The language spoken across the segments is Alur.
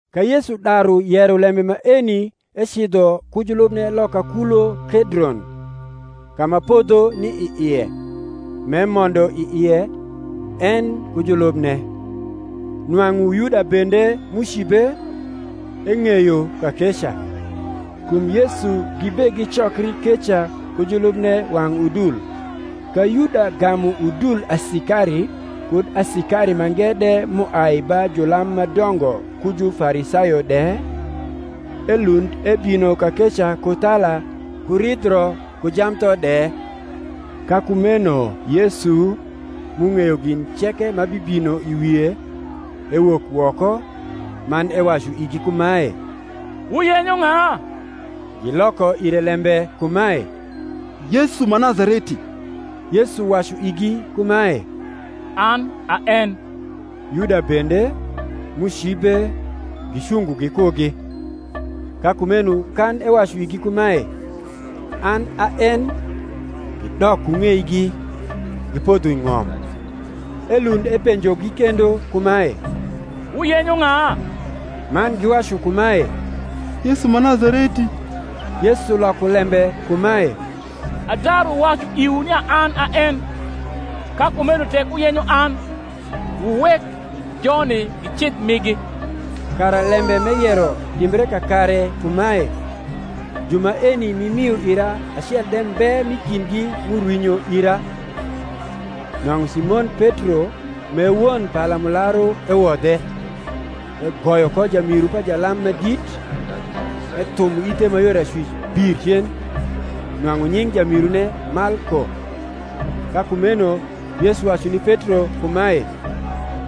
Ka Yesu daru yero lembe maeni ecidho ku julubne loka kulo Kedron, ka ma podho ni i ie, m’emondo i ie, en ku julubne. Nwang’u Yuda bende m’ucibe, eng’eyo kakeca: kum Yesu gibegicokri keca ku julubne wang’ udul. Ka Yuda gamu udul asikari, kud asikari mange de m’uai ba julam ma dongo ku Jufarisayo de, elund ebino kakeca ku thala ku ridhio ku jamtho de. Ka kumeno Yesu, m’ung’eyo gin ceke ma bibino i wie, ewok woko, man ewacu igi kumae, Wuyenyo ng’a? Giloko ire lembe kumae, Yesu ma Nazareti. Yesu wacu igi kumae, An a en. Yuda bende, m’ucibe, gicungo gikugi. Ka kumeno kan ewacu igi kumae, An a en, gidok ku ng’eigi, gipodho i ng’om. Elund epenjogi kendo kumae, Wuyenyo ng’a? man giwacu kumae, Yesu ma Nazareti. Yesu loko lembe kumae, Adaru wacu iwu nia an a en; ka kumeno tek wuyenyo an, wuwek joni gicidh migi: kara lembe m’eyero timbre kakare kumae, Ju maeni m’imio ira acel de mbe m’i kindgi m’urwinyo ira. Nwang’u Simon Petro m’e won palamularu ewodhe, egoyo ko jamiru pa jalam ma dit, ethumo ithe ma yor acwic bir cen. Nwang’u nying’ jamirune Malko. Ka kumeno Yesu wacu ni Petro kumae,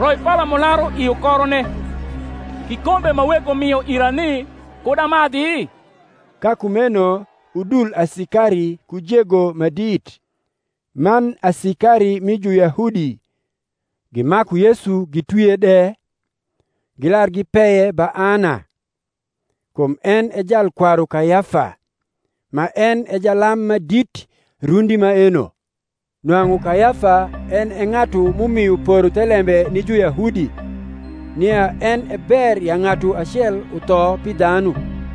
Roi palamularu i ukorone: kikombe ma Wego mio ira ni, kud amadhi? Ka kumeno udul asikari ku jego ma dit, man asikari mi Juyahudi, gimaku Yesu gitwie de, gilar gipeye ba Ana; kum en e jalkwaru Kayafa, ma en e jalam ma dit rundi maeno. Nwang’u Kayafa en e ng’atu m’umio poro thelembe ni Juyahudi, nia en e ber ya ng’atu acel utho pi dhanu.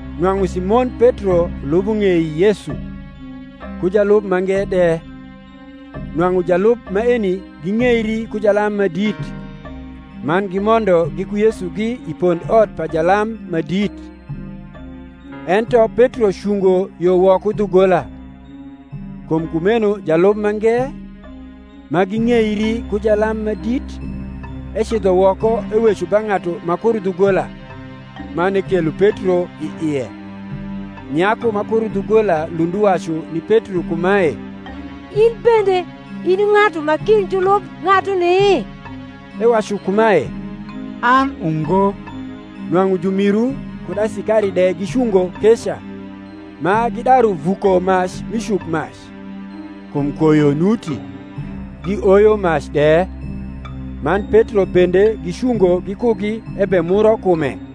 Nwang’u Simon Petro lubo ng’ei Yesu, ku jalub mange de. Nwang’u jalub maeni ging’eiri ku jalam ma dit, man gimondo giku Yesugi i pondot pa jalam ma dit; ento Petro cungo yo woko dhugola. Kum kumeno jalub mange, ma ging’eiri ku jalam ma dit, ecidho woko eweco ba ng’atu ma kuro dhugola, man ekelo Petro i ie. Nyaku ma kuro dhugola lund uwacu ni Petro kumae, In bende in i ng’atu ma kind julub ng’atuni? Ewacu kumae, An ungo. Nwang’u jumiru kud asikari de gicungo keca, ma gidaru vuko mac mi cukmac; kum koyo nuti; gioyo mac de: man Petro bende gicungo gikugi ebemuro kume.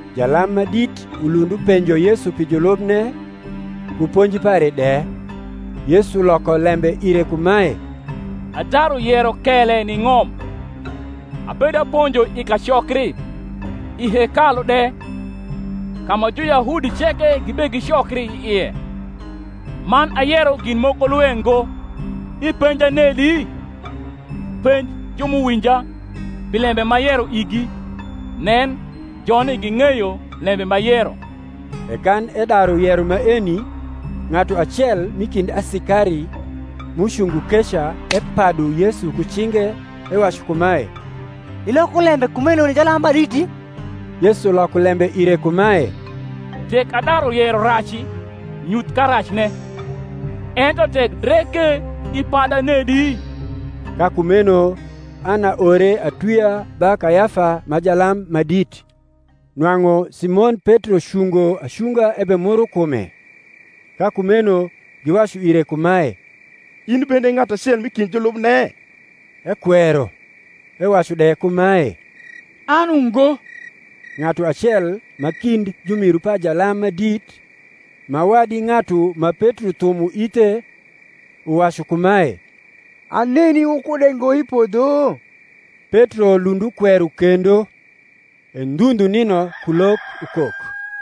Jalam ma dit ulund upenjo Yesu pi julubne, ku ponji pare de. Yesu loko lembe ire kumae, Adaru yero kele ni ng’om; abedaponjo i kacokri, i hekalu de, ka ma Juyahudi ceke gibegicokri i ie; man ayero gin moko lwe ngo. Ipenja nedi? penj ju m’uwinja, pi lembe m’ayero igi; nen, joni ging’eyo lembe m’ayero. E kan edaru yero maeni, ng’atu acel m’i kind asikari m’ucungo keca epadu Yesu ku cinge, ewacu kumae, Iloko lembe kumeno ni jalam ma diti? Yesu loko lembe ire kumae, Tek adaru yero raci, nyuth karacne: ento tek dre ke, ipada nedi? Ka kumeno Ana ore atwia ba Kayafa ma jalam ma dit. Nwang’u Simon Petro cungo acunga ebemuro kume. Ka kumeno giwacu ire kumae, In bende i ng’atu acel m’i kind julubne? Ekwero, ewacu de kumae, An ungo. Ng’atu acel ma kind jumiru pa jalam ma dit, ma wadi ng’atu ma Petro thumo ithe, uwacu kumae, Aneni wukude ngo i podho? Petro lund ukwero kendo: e ndhu ndhu nino kulok ukok.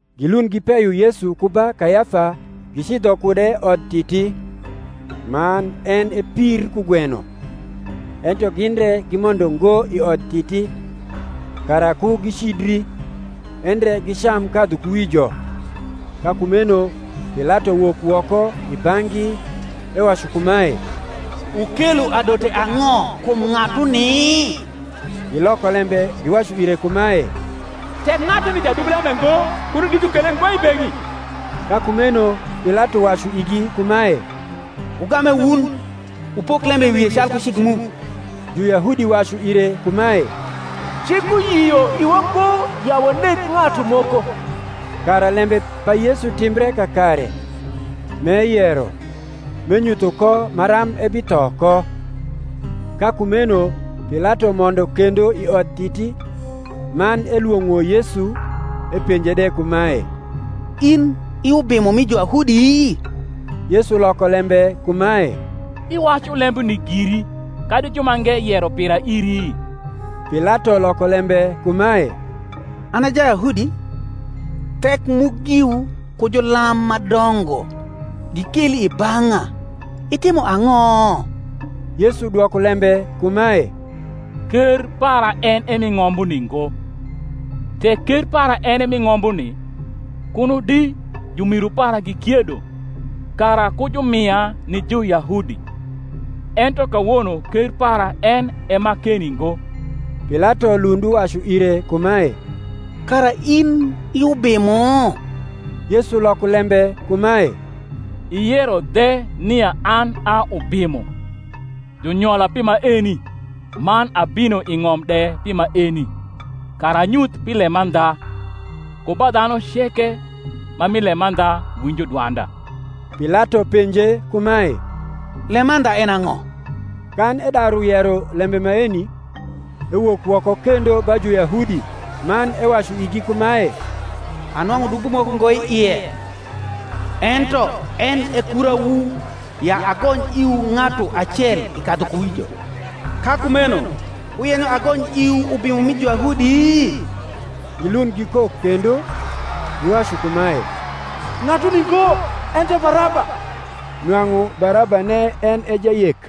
Gilund gipeyo Yesu ku ba Kayafa gicidho kude Odtiti: man en e pir kugweno; ento gin re gimondo ngo i Odtiti, kara ku gicidri, endre gicam kadhukuwijo. Ka kumeno Pilato wok woko i bang’gi, ewacu kumae, Wukelo adote ang’o kum ng’atuni? Giloko lembe giwacu ire kumae, Tek ng’atuni jadub lembe ngo, kuno di jukele ngo i beng’i. Ka kumeno Pilato wacu igi kumae, Wugame wun, wupok lembe i wie calku cik mu. Juyahudi wacu ire kumae, Cik uyio iwa ngo ya waneg ng’atu moko: kara lembe pa Yesu timbre kakare, m’eyero, m’enyutho ko maram ebitho ko. Ka kumeno Pilato mondo kendo i Odtiti, man elwong’o Yesu, epenje de kumae, In i Ubimo mi Juyahudi? Yesu loko lembe kumae, Iwacu lembuni giri, kadi jumange yero pira iri? Pilato loko lembe kumae, An a Jayahudi? Thek mu giwu ku julam ma dongo gikeli i bang’a: itimo ang’o? Yesu dwoko lembe kumae, Ker para en e mi ng’ombuni ngo: tek ker para en e mi ng’ombuni, kuno di jumiru para gikiedo, kara ku jumia ni Juyahudi: ento kawono ker para en e ma keni ngo. Pilato lund uwacu ire kumae, Kara in i ubimo? Yesu loko lembe kumae, Iyero dhe nia an a ubimo. Junyola pi maeni, man abino i ng’om de pi maeni, kara anyuth pi lemandha. Ku ba dhanu ceke ma mi lemandha winjo dwanda. Pilato penje kumae, Lemandha en e ang’o? Kan edaru yero lembe maeni, ewok woko kendo ba Juyahudi, man ewacu igi kumae, Anwang’u dubo moko ngo i ie. Ento en e kurawu, ya agony iwu ng’atu acel i kadhukuwijo: ka kumeno wuyenyo agony iwu Ubimo mi Juyahudi? Gilund gikok kendo, giwacu kumae, Ng’atuni ngo, ento Baraba. Nwang’u Barabane en e jayek.